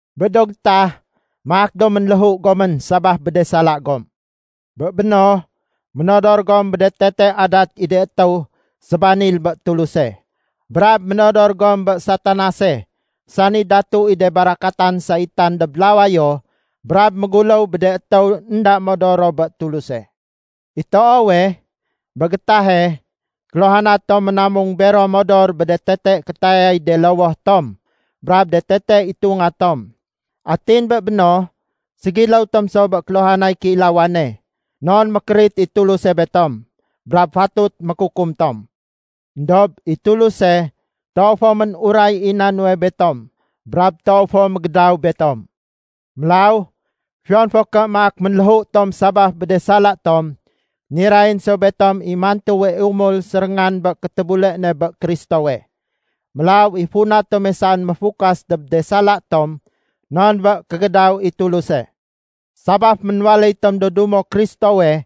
Bé do gétah, maak do ménléhu gomén sabaf bé de sala gom. Bé béno, ménodor gom bé de tete adat i do étéw sébanil bé Tuluse. Brab ménodor gom bé Satanase sani datu i de barakatan saitan dob lawayo brab méguléw bé de étéw énda modor ro bé Tuluse. I toowe, bé gétahe, kéluhana tom ménamung bero modor bé de tete kétayay de lowoh tom brab de tete itunga tom. Atin bé béno, ségiléw tom so bé kéluhanay kéilawane, non mékérit i Tuluse betom, brab fatut mékukum tom. Endob i Tuluse toow fo ménuray i na nuwe betom brab toow fo mégédaw betom. Mélaw fiyon fo ké maak ménléhu tom sabaf bé de sala tom, nirayén so betom i mantuwe umul séréngan bé kéfétébule ne bé Kristowe. Mélaw i funa tome saén méfukas dob de sala tom non bé kégédaw i Tuluse. Sabaf ménwaléy tom do dumo Kristowe,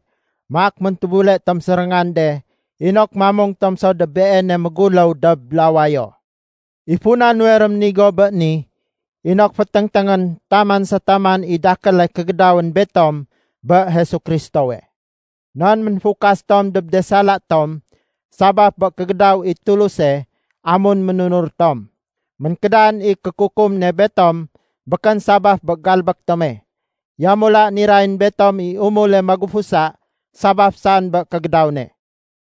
maak méntébule tom séréngan de inok mamung tom so dob Beene méguléw dob lawayo. I funa nuwe réménigo bé ni, inok féténgténgén taman sa taman i dakéle kégédawén betom bé Jesu Kristowe. Non ménfukas tom dob de sala tom sabaf bé kégédaw i Tuluse amun ménunur tom. Ménkédan i kékukum ne betom békén sabaf bé galbék tome, yamula nirayén betom i umule magufusa sabaf saén bé kégédaw ne.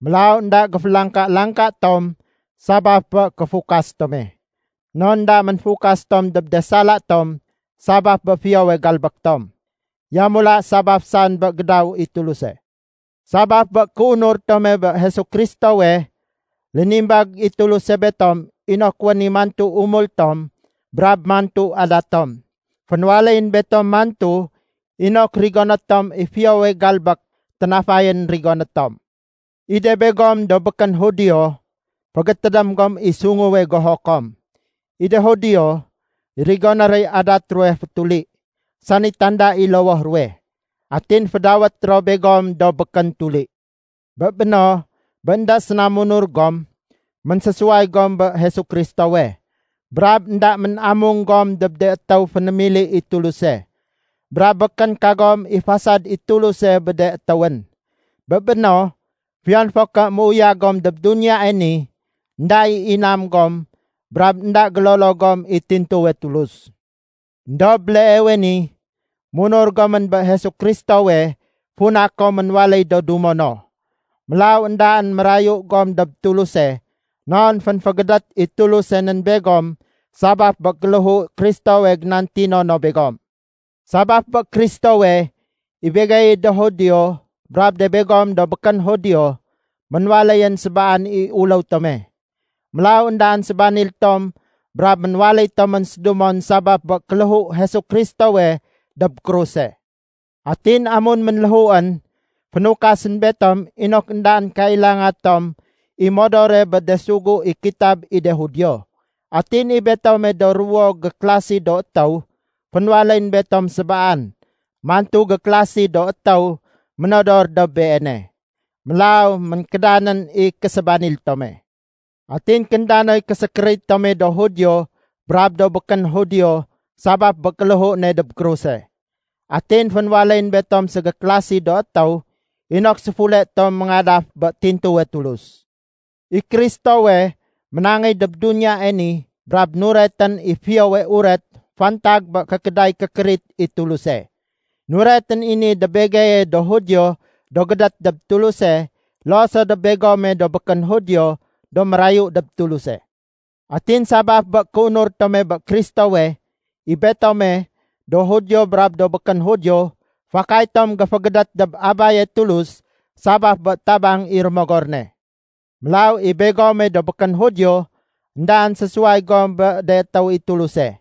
Mélaw énda géfélangka-langka tom sabaf bé kéfukas tome, non énda ménfukas tom dob de sala tom sabaf bé fiyowe galbék tom. Yamula sabaf saén bé gédaw i Tuluse. Sabaf bé kéunur tome bé Jesu Kristowe, lénimbag i Tuluse betom inok wén i mantu umul tom brab mantu adat tom. Fénwaléyén betom mantu inok rigoné tom i fiyowe galbék ténafayén rigoné tom. I de begom do békén Judio, fégétédém gom i sunguwe goho kom. I de Judio, rigoné roy adat ruwe fétuli (sani tanda i lowoh ruwe), atin fédawét ro begom do “Békén tuli”. Bé béno, bé énda séna munur gom, ménsésuway gom bé Jesu Kristowe, brab énda mén-amung gom dob de étéw fénémili i Tuluse. Brab békén kagom i fasad i Tuluse bé de étéwén. Bé béno, fiyon fo ké méuyag gom dob duniyae ni, énda i inam gom brab énda gélolo gom i tintuwe Tulus. Endob béleewe ni, munur gomén bé Jesu Kristowe funa kom ménwaléy do dumo no. Mélaw éndaén mérayu gom dob Tuluse non fénfégédét i Tuluse nén begom sabaf bé kéléhu Kristowe génantino no begom. Sabaf bé Kristowe, i begeye do Judio brab de begom do békén Judio, ménwaléyén sébaan i uléw tome. Mélaw éndaén sébanil tom brab ménwaléy tomén sédumon sabaf bé kéléhu Jesu Kristowe dob kruse. Atin amun ménléhuén, fénukasén betom inok éndaén kailanga tom i modore bé de sugu i kitab i de Judio. Atin i betome do ruwo gékélasi do étéw, fénwaléyén betom sébaan mantu gékélasi do étéw ménodor dob Beene. Mélaw ménkédanén i késébanil tome. Atin kénda noy késékérit tome do Judio brab do békén Judio sabaf bé kéléhu ne dob kruse. Atin fénwaléyén betom ségékélasi do étéw inok séfule tom méngadaf bé tintuwe Tulus. I Kristowe ménangéy dob duniyae ni brab nuretén i Fiyowe Uret fantag bé kékéday kékérit i Tuluse. Nuretén i ni dob begeye do Judio do gédét dob Tuluse loo so dob begome do békén Judio do mérayu dob Tuluse. Atin sabaf bé kéunur tome bé Kristowe, i betome, do Judio brab do békén Judio, fakay tom géfégédét dob Abaye Tulus sabaf bé tabang i Rémogor ne. Mélaw i begome do békén Judio, éndaén sésuway gom bé de étéw i Tuluse.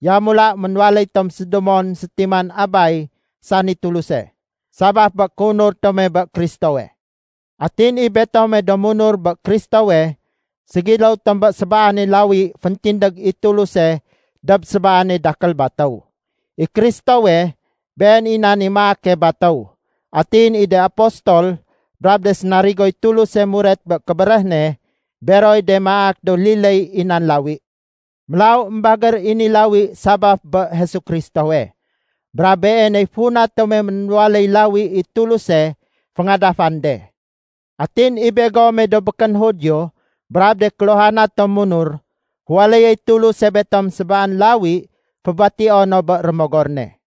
Yamula ménwaléy tom sédumon sétiman Abay sani Tuluse, sabaf bé kéunur tome bé Kristowe. Atin i betome do munur bé Kristowe, ségiléw tom bé sébaane lawi féntindég i Tuluse dob sébaane dakél batéw. I Kristowe, Been i nan i maake batéw. Atin i de apostol brab de sénarigoy Tuluse muret bé kébéréh ne, beroy de maak do liléy i nan lawi. Mélaw émbagér i ni lawi sabaf bé Jesu Kristowe, brab Beeney funa tome ménwaléy lawi i Tuluse féngadafan de. Atin i begome do békén Judio brab de kéluhana tom munur, féwaléyéy Tuluse betom sébaan lawi fébatio no bé Rémogor ne.